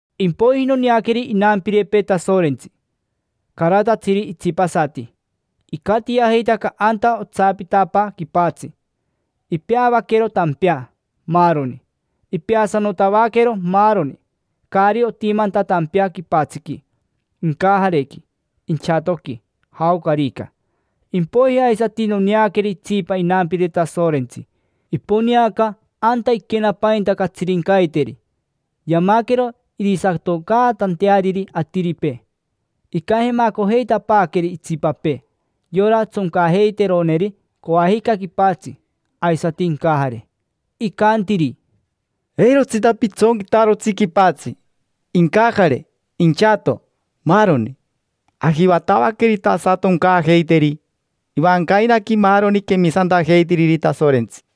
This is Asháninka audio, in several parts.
Impoiji noneaqueri inampirepee Tasorentsi, caratatsiri itsipasati, icatiajeitaca anta otsapitapaa quipatsi; ipeavaquero tampea, maaroni. Ipeasanotavaquero maaroni, caari otimanta tampea quipatsiqui, incajarequi, inchatoqui, jaocarica. Impoiji aisati noneaqueri itsipa inampire Tasorentsi, iponeaca anta iquenapainta catsirincaiteri, yamaquero irisatoncaatanteariri atiripee. Icajemacojeitapaaqueri itsipapee, yora tsoncajeiteroneri coajica quipatsi aisati incajare. Icantiri: —Eirotsita pitsonquitarotsi quipatsi, incajare, inchato, maaroni. Ajivatavaquerita asatoncaajeiteri ivancainaqui maaroni quemisantajeitiriri Tasorentsi.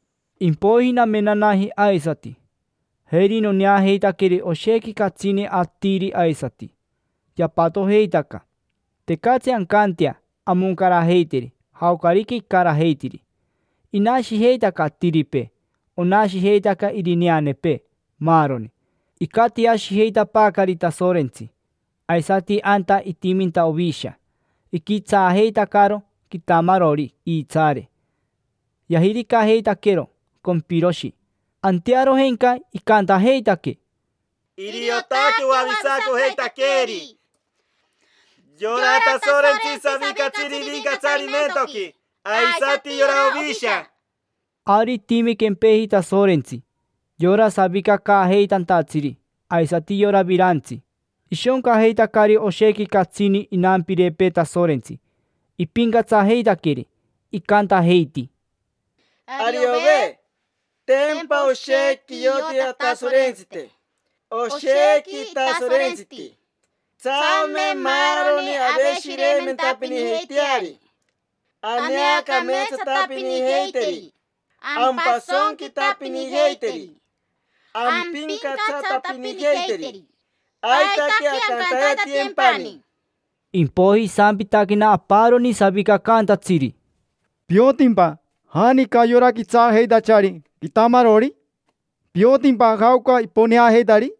Impoiji namenanaji aisati, jeri noneajeitaqueri oshequi catsini atiri aisati, yapatojeitaca: tecatsi ancantea amoncarajeiteri jaocarica icarajeitiri. Inashijeitaca atiripee, onashijeitaca irineanepee, maaroni. Icatiashijeitapaacari Tasorentsi, aisati anta itiminta Ovisha. Iquitsaajeitacaro quitamarori iitsaare, yajiricajeitaquero compiroshi. Antearojenca icantajeitaque: —Iriotaque oavisacojeitaqueeri yora Tasorentsi savicatsiri ivincatsarimentoqui, aisati yora Ovisha. Ari itimi quempeji Tasorentsi yora savicacaajeitantatsiri aisati yora virantsi. Ishoncajeitacari oshequi catsini inampirepee Tasorentsi, ipincatsajeitaqueri, icantajeiti: Ariove, tempa oshequi ioti Atasorentsite, oshequi itasorentsiti. Tsame maaroni aveshireimentapinijeiteari, aneacameetsatapinijeiteri, ampasonquitapinijeiteri, ampincatsatapinijeiteri; aitaque ancantaitatiyempani. Impoiji isampitaquena aparoni savicacaantatsiri: —¿Piotimpa janica yora quitsaajeitachari quitamarori? ¿Piotimpa jaoca iponeajeitari?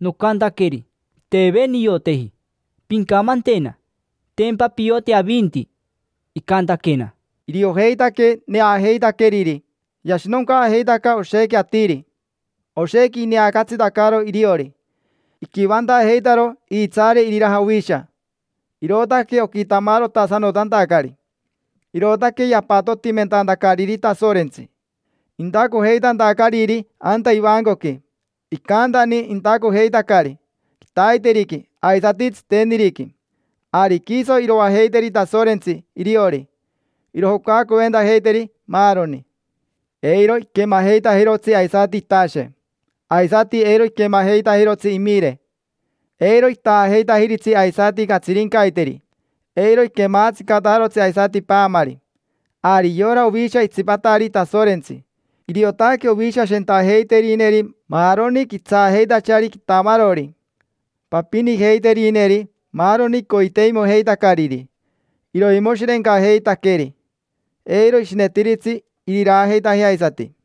Nocantaqueri: —Teve nioteji. Pincamantena: tempa pioti avinti. Icantaquena: —Iriojeitaque neajeitaqueriri yashinoncaajeitaca oshequi atiri; oshequi ineacatsitacaro iriori. Iquivantajeitaro iitsaare iriraja Ovisha, irootaque oquitamarotasanotantacari. Irootaque yapatotimentantacariri Tasorentsi, intacojeitantacariri anta ivancoqui. Icantani intacojeitacari: quitaiteriqui aisati tsiteniriqui. Ari quiso iroajeiteri Tasorentsi iriori, irojocacoventajeiteri, maaroni. Eiro iquemajeitajirotsi aisati itashe, aisati eiro iquemajeitajirotsi imire. Eiro itaajeitajiritsi aisati catsirincaiteri, eiro iquemaatsicatajarotsi aisati paamari. Ari yora Ovisha itsipatari Tasorentsi: iriotaque Ovisha shentajeiterineri maaroni quitsaajeitachari quitamarori, papinijeiterineri maaroni coiteimojeitacariri. Iroimoshirencajeitaqueri, eiro ishinetiritsi iriraajeitajea aisati.